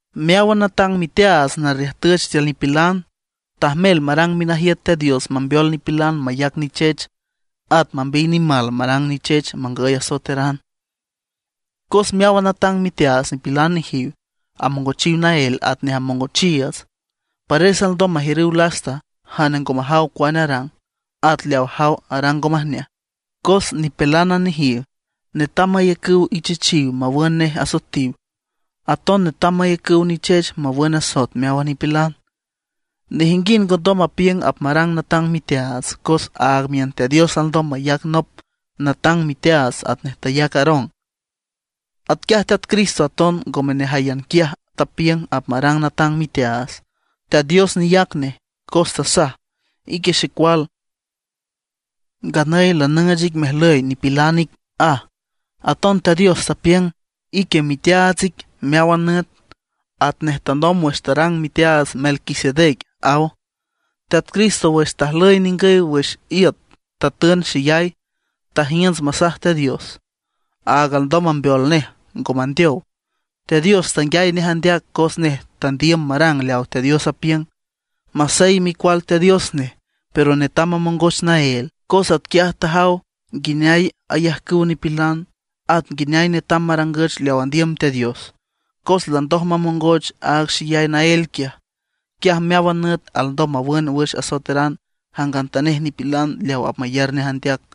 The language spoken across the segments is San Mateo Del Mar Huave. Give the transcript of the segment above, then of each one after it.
Meáwan natang miteaats narriüjtüch tiül nipilan, tajmel marang minajiüt Teat Dios mambeol nipilan mayac nichech, at mambiy nimal marang nichech mangüy asoeteran. Cos meáwan natang miteaats nipilan nejiw, amongochiw naél atnej amongochiiüts. Pares alndom majiürüw lasta jane ngo majaw cuane arang, at leaw ajaw arang ngo majneaj. Cos nipilánan nejiw, netam mayacüw ichechiw mawün nej asoetiw, aton netam mayacüw nichech mawün asoet meáwan nipilan. Nejinguind ngondom mapiüng apmarang natang miteaats, cos áag miün Teat Dios alndom mayac nop natang miteaats atnej tayac Aarón. Atquiaj Teat Cristo aton ngome nejáyan quiaj tapiüng apmarang natang miteaats, Teat Dios neyac nej, cos tasaj: Ique Xecual, nganüy lanüüch ic mejlüy nipilan ic, aj. Aton Teat Dios tapiüng: Ique miteaats ic meáwan nüt, atnej tanomb wüx tarang miteaats Melquisedec, aw. Teat Cristo wüx tajlüy ningüy wüx iüt tatün xeyay, tajiünts masaj Teat Dios, aaga alndom mambeol nej ngo mandeow. Teat Dios tanguiay nej andeac cos nej tandiüm marang leaw Teat Dios apiüng. Masey Micual Teat Dios nej, pero netam mamongoch naél, cos atquiaj tajaw nguineay ayajcüw nipilan, at nguineay netam marangüch leaw andiüm Teat Dios. Cos landoj mamongoch aaga xeyay naél quiaj; quiaj meáwan nüt alndom mawün wüx asoeteran jangantanej nipilan leaw apmayar nej andeac.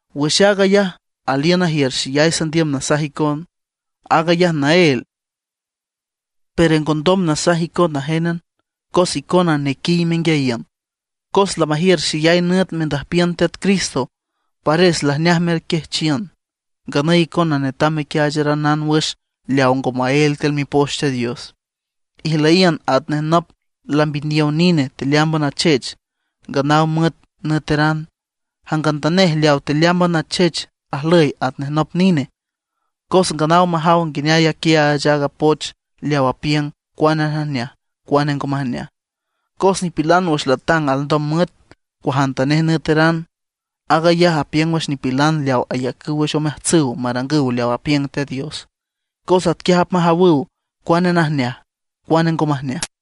Wüx aag ayaj aliün najiür xeyay sandiüm nasaj icon; aag ayaj naél, pero ngondom nasaj icon najen cos icona nequiy menguiayiün. Cos lamajiür xeyay nüt mendüjpiün Teat Cristo, pares lajneaj merquiajchiün; nganüy icona netam mequiaacharanan wüx leaw ngo maél tiül Mipoch Teat Dios. Ijlüyiün atnej nop lambiniow nine tealeámban achech, nganaw müet nüeteran. Jangantanej leawa tealeámban achech ajlüy atnej nop nine, cos nganaw majaw nguineay aquiaach aaga poch leaw apiüng cuane najneaj cuane ngo majneaj. Cos nipilan wüx latang alndom müet cuajantanej nüeteran. Aag ayaj apiüng wüx nipilan leaw ayacüw wüx omeajtsüw marangüw leaw apiüng Teat Dios, cos atquiaj apmajawüw cuane najneaj cuane ngo majneaj.